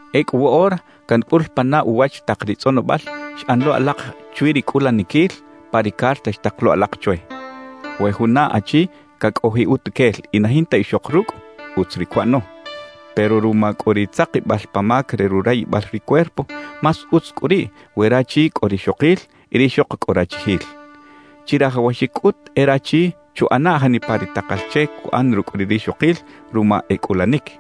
Ecꞌu woꞌora cancꞌul pana uwach tak ri tzꞌonobal xꞌan lo alak chwi ri cꞌulaniquil pa ri carta xtak lo alak chwe. We juna achi cacꞌojiꞌ utuquel y na jinta ixok rucꞌ, utz ri cuꞌano. Pero ruma cꞌu ri tzakibal pa mac re rurayibal ri cuerpo, más utz cꞌu riꞌ we rachi cꞌo rixokil y rixok cꞌo rachijil. Chirajawaxic cꞌut e rachi chuꞌana janipa ri takal che cuꞌan rucꞌ ri rixokil ruma e cꞌulanic;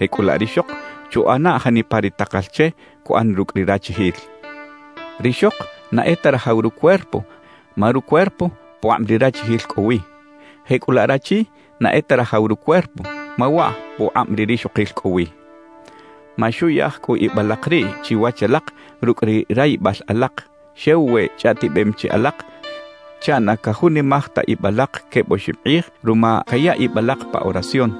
jecꞌulaꞌ rixok chuꞌana janipa ri takal che cuꞌan rucꞌ ri rachijil. Rixok na e ta rajaw rucuerpo ma rucuerpo pukꞌab ri rachijil cꞌo wi; jecꞌulaꞌ rachi na e ta rajaw rucuerpo ma waꞌ pukꞌab ri rixokil cꞌo wi. Maxuꞌyaj cꞌu ib alak riꞌ chiwach alak rucꞌ ri rayibal alak, xew we chꞌaꞌtibem chi alak chaꞌ na cajunimaj ta ib alak queb oxib kꞌij ruma caya ib alak pa oración.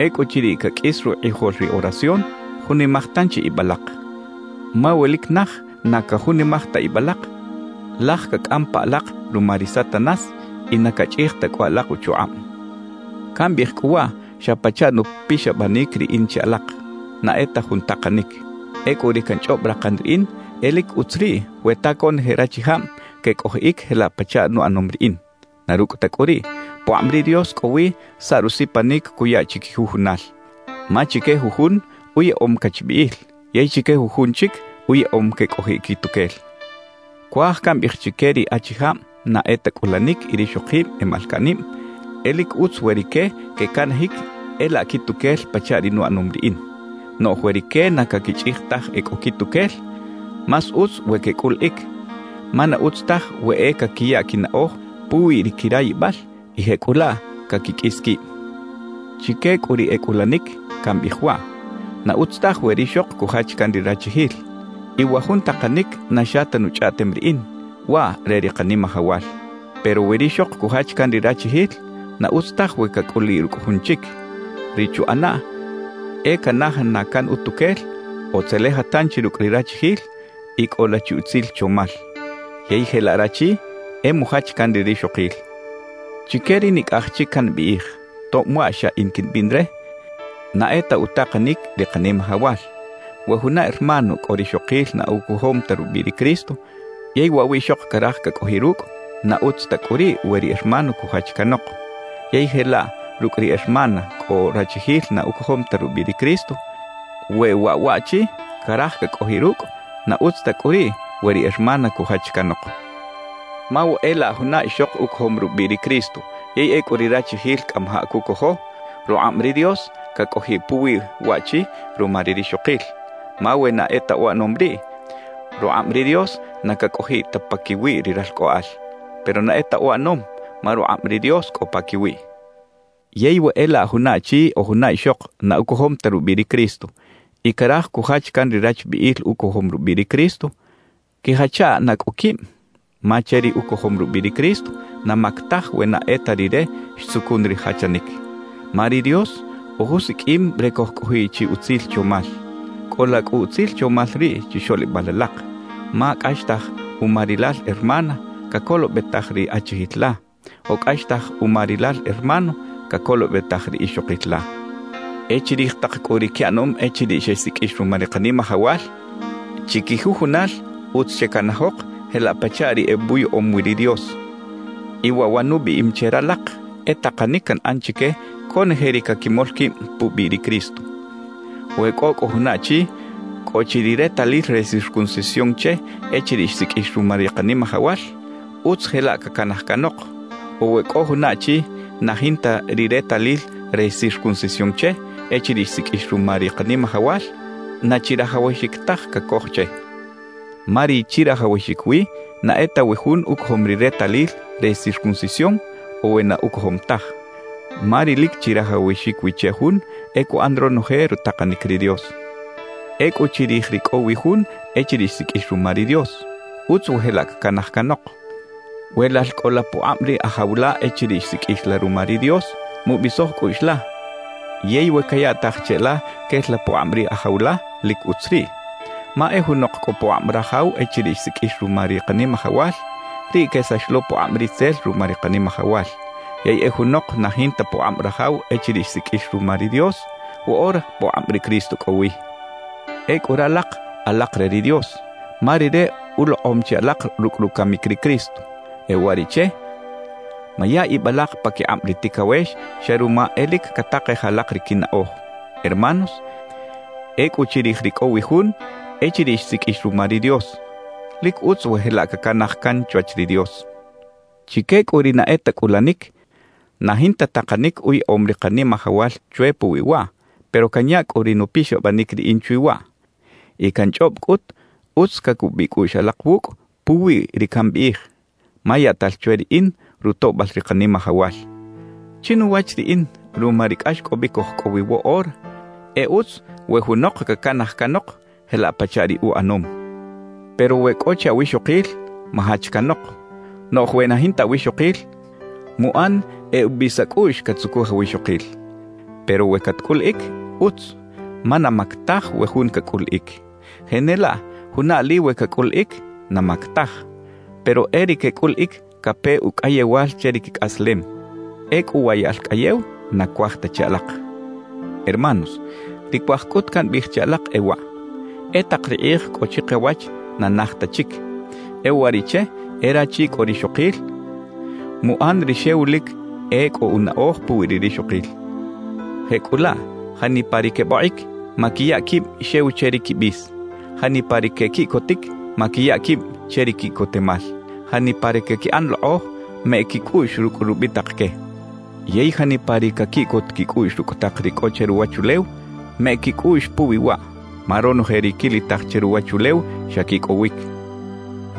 Ecꞌuchiriꞌ caqꞌuis rukꞌijol ri oración, junimaj tanchi ib alak. Ma we lic naj na cajunimaj ta ib alak, laj cacꞌam pa alak ruma ri Satanás y na cachꞌij ta cꞌu alak uchukꞌab. Cambiꞌij cꞌu waꞌ xa pachaꞌ nupixabanic riꞌin che alak; na e ta jun takanic. Ecꞌu ri canchꞌob rakan riꞌin e lic utz riꞌ we ta conoje rachijab quecꞌojiꞌic jelaꞌ pachaꞌ nuꞌanom riꞌin. Na rucꞌ ta cꞌu riꞌ, pukꞌab ri Dios cꞌo wi saꞌ rusipanic cuya chiquijujunal. Ma chique jujun uyaꞌom cachbiꞌil, yey chique jujun chic uyaꞌom quecꞌojiꞌ quituquel. Cuaj cambiꞌij chique ri achijab na e ta cꞌulanic y rixokib e malcaꞌnib, e lic utz we rique quecanajic e laꞌ quituquel pachaꞌ ri nuꞌanom riꞌin. Noꞌj we rique na caquichꞌij taj e cꞌo quituquel, más utz we quecꞌuliꞌic, ma na utz taj we e caquiya quinaꞌoj puwi ri quirayibal y jecꞌulaꞌ caquiqꞌuis quib. Chique cꞌu ri e cꞌulanic, cambiꞌij waꞌ: Na utz taj we rixok cujach can ri rachijil. Y wa jun takanic na xa ta nuchꞌaꞌtem riꞌin, waꞌ re ri Kanimajawal. Pero we rixok cujach can ri rachijil, na utz taj we cacꞌuliꞌ rucꞌ jun chic. Ri chuꞌanaꞌ e canaja na can utuquel o tzeleja tanchi rucꞌ ri rachijil y cꞌola chi utzil chomal. Yey jelaꞌ rachi, e mujach can ri rixokil. Chique ri nicꞌaj chic cambiꞌij, tob waꞌ xa in quimbiꞌn re, na e ta utakanic ri Kanimajawal: We juna hermano cꞌo rixokil na ucojom ta rubiꞌ ri Cristo, yey waꞌ wiꞌxok caraj cacꞌojiꞌ rucꞌ, na utz ta cꞌu riꞌ we ri hermano cujach canok. Yey jelaꞌ rucꞌ ri hermana cꞌo rachijil na ucojom ta rubiꞌ ri Cristo, we waꞌ waꞌchi caraj cacꞌojiꞌ rucꞌ, na utz ta cꞌu riꞌ we ri hermana cujach canok. Ma we e laꞌ juna ixok ucojom rubiꞌ ri Cristo yey ecꞌu ri rachijil cꞌamajaꞌ cucojo, rukꞌab ri Dios cacꞌojiꞌ puwi waꞌchi ruma ri rixokil. Ma we na e ta uꞌanom riꞌ, rukꞌab ri Dios na cacꞌojiꞌ ta paquiwi ri ralcꞌoꞌal. Pero na e ta uꞌanom, ma rukꞌab ri Dios cꞌo paquiwiꞌ. Yey we e laꞌ juna achi o juna ixok na ucojom ta rubiꞌ ri Cristo y caraj cujach can ri rachbiꞌil ucojom rubiꞌ ri Cristo, quijacha na cꞌu quib. Ma che ri ucojom rubiꞌ ri Cristo, na mac taj we na e ta rire xtzucun ri jachanic. Ma ri Dios ojusiqꞌuim re cojcꞌojiꞌ chi utzil chomal. Cꞌola cꞌu utzil chomal riꞌ chixoꞌlibal alak, ma cꞌaxtaj uma rilal hermana, cacolobetaj ri achijil la; o cꞌaxtaj uma rilal hermano, cacolobetaj ri ixokil la. E chirij tak cꞌu ri quiꞌanom echiriꞌ xesiqꞌuix ruma ri Kanimajawal, chiquijujunal utz checanajok jelaꞌ pachaꞌ ri ebuyaꞌom wi ri Dios. Y waꞌ wa nubiꞌim che ralak, e takanic canꞌan chique conoje ri caquimol quib pubiꞌ ri Cristo. We cꞌo cꞌu juna achi cꞌo chi ri retalil re circuncisión che echiriꞌ xsiqꞌuix ruma ri Kanimajawal, utz jelaꞌ cacanaj canok. O we cꞌo juna achi na jinta ri retalil re circuncisión che echiriꞌ xsiqꞌuix ruma ri Kanimajawal, na chirajawaxic taj cacoj che. Ma ri chirajawaxic wi na e ta we jun ucojom ri retalil re circuncisión o we na ucojom taj, ma ri lic chirajawaxic wi che jun e cuꞌan ronoje rutakanic ri Dios. Ecꞌu chirij ri cꞌo wi jun echiriꞌ xsiqꞌuix ruma ri Dios, utz we jelaꞌ cacanaj canok. We lal cꞌo la pukꞌab ri ajaw la echiriꞌ xsiqꞌuix la ruma ri Dios, mubisoj cꞌuꞌx la; yey we cayaꞌtaj che la quel la pukꞌab ri ajaw la, lic utz riꞌ. Ma e junok cꞌo pukꞌab rajaw echiriꞌ xsiqꞌuix ruma ri Kanimajawal, riꞌ quesax lo pukꞌab ritzel ruma ri Kanimajawal. Yey e junok na jinta pukꞌab rajaw echiriꞌ xsiqꞌuix ruma ri Dios, woꞌora pukꞌab ri Cristo cꞌo wi. Ecꞌu ralak alak re ri Dios, ma Rire ulokꞌom chi alak rucꞌ rucamic ri Cristo. E uwariꞌche, maya ib alak paquikꞌab ri ticawex xa ruma e lic catakej alak ri quinaꞌoj. Hermanos, ecꞌu chirij ri cꞌo wi jun echiriꞌ xsiqꞌuix ruma ri Dios, lic utz we jelaꞌ cacanaj can chwach ri Dios. Chique cꞌu ri na e ta cꞌulanic, na jinta takanic uyaꞌom ri Kanimajawal chwe puwi waꞌ, pero canya cꞌu ri nupixabanic riꞌin chwi waꞌ. Y canchꞌob cꞌut utz cacubiꞌ cꞌuꞌx alak wucꞌ puwi ri cambiꞌij, ma yaꞌtal chwe riꞌin rutoꞌbal ri Kanimajawal. Chinuwach riꞌin, ruma ri cꞌaxcꞌobic oj cꞌo wi woꞌora, e utz we junok cacanaj canok jelaꞌ pachaꞌ ri uꞌanom. Pero we cꞌo chi awixokil, majach canok. Noꞌj we na jinta awixokil, muꞌan e ubis acꞌuꞌx catzucuj awixokil. Pero we catcꞌuliꞌic, utz; ma na mac taj we jun cacꞌuliꞌic. Jenelaꞌ juna ali we cacꞌuliꞌic, na mac taj. Pero e ri quecꞌuliꞌic cape ucꞌayewal che ri quicꞌaslem. Ecꞌu wa yaꞌl cꞌayew na cuaj ta che alak. Hermanos, ri cuaj cꞌut cambiꞌij che alak e waꞌ: E tak ri kꞌij cꞌo chikawach na naj ta chic. E uwariꞌche e rachi cꞌo rixokil, muꞌan ri xew lic e cꞌo unaꞌoj puwi ri rixokil. Jecꞌulaꞌ janipa ri quebokꞌic, maquiya quib xew che ri quibis. Janipa ri quequiꞌcotic, maquiya quib che ri quiꞌcotemal. Janipa ri caquiꞌan lokꞌoj, meꞌec quicꞌuꞌx rucꞌ rubitak que. Yey janipa ri caquiꞌcot quicꞌuꞌx rucꞌ tak ri cꞌo che ruwachulew, meꞌec quicꞌuꞌx puwi waꞌ. Ma ronoje ri quilitaj che ruwachulew, xa quicꞌowic.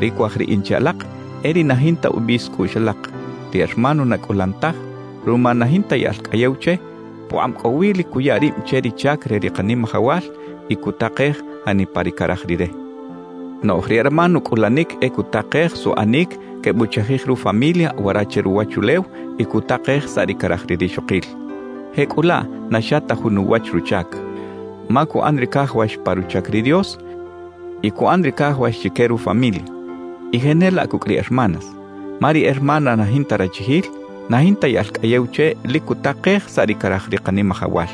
Ri cuaj riꞌin che alak e ri na jinta ubis cꞌuꞌx alak. Ri hermano na cꞌulan taj, ruma na jinta yaꞌl cꞌayew che, pukꞌab cꞌowi lic cuya rib che ri chac re ri Kanimajawal y cutakej janipa ri caraj Rire. Noꞌj ri hermano cꞌulanic e cutakej suꞌanic quebuchajij rufamilia wara che ruwachulew y cutakej saꞌ ri caraj ri rixokil. Jecꞌulaꞌ na xa ta jun uwach ruchac, ma cuꞌan ri cajawax pa ruchac ri Dios y cuꞌan ri cajawax chique rufamilia. Y jenelaꞌ cucꞌ ri hermanas. Ma ri hermana na jinta rachijil, na jinta yaꞌl cꞌayew che lic cutakej saꞌ ri caraj ri Kanimajawal,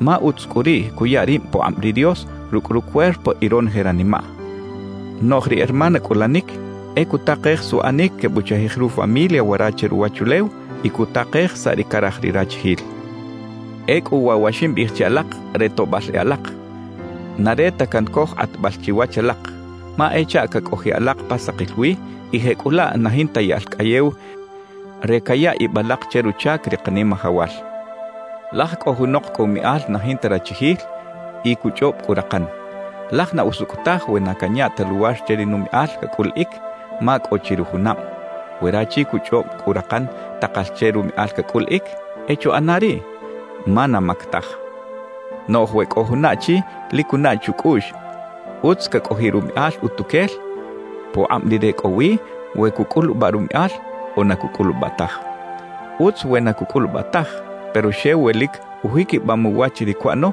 ma utz cꞌu riꞌ cuya rib pukꞌab ri Dios rucꞌ rucuerpo y ronoje ranimaꞌ. Noꞌj ri hermana cꞌulanic e cutakej suꞌanic quebuchajij rufamilia wara che ruwachulew y cutakej saꞌ ri caraj ri rachijil. Ecꞌu waꞌ wa ximbiꞌij che alak re toꞌbal e alak, na re ta cancoj kꞌatbal chiwach alak; ma e chaꞌ cacꞌojiꞌ alak pa sakil wi y jecꞌulaꞌ na jinta yaꞌl cꞌayew re caya ib alak che ruchac ri Kanimajawal. Laj cꞌo junok cꞌo umiꞌal na jinta rachijil y cuchꞌob cꞌu rakan: «Laj na usucꞌ taj we na canya ta luwar che ri numiꞌal cacꞌuliꞌic, ma cꞌo chi rujunab.» We rachi cuchꞌob cꞌu rakan takal che rumiꞌal cacꞌuliꞌic, e chuꞌana riꞌ, ma na mac taj. Noꞌj we cꞌo juna achi lic cunaꞌ chucꞌuꞌx utz cacꞌojiꞌ rumiꞌal utuquel, pukꞌab rire cꞌo wi we cucꞌulubaꞌ rumiꞌal o na cucꞌulubaꞌ taj. Utz we na cucꞌulubaꞌ taj, pero xew we lic ujiquibam uwach ri cuꞌano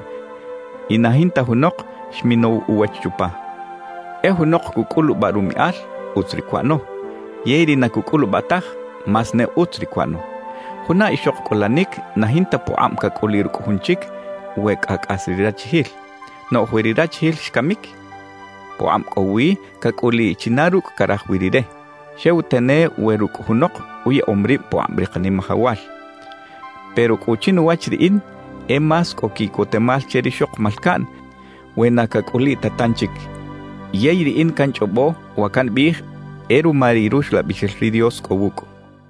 y na jinta junok xminow uwach chupa. E junok cucꞌulubaꞌ rumiꞌal, utz ri cuꞌano; yey ri na cucꞌulubaꞌ taj, más ne utz ri cuꞌano. Juna ixok cꞌulanic na jinta pukꞌab cacꞌuliꞌ rucꞌ jun chic we cꞌa cꞌas ri rachijil. Noꞌj we ri rachijil xcamic, pukꞌab cꞌo wi cacꞌuliꞌ china rucꞌ caraj wi rire, xew tane we rucꞌ junok uyaꞌom rib pukꞌab ri Kanimajawal. Pero cꞌu chinuwach riꞌin e más cꞌo quiꞌcotemal che rixok malcaꞌn we na cacꞌuliꞌ ta tanchic, yey riꞌin canchꞌobo wa cambiꞌij e ruma ri Ruxlabixel ri Dios cꞌo wucꞌ.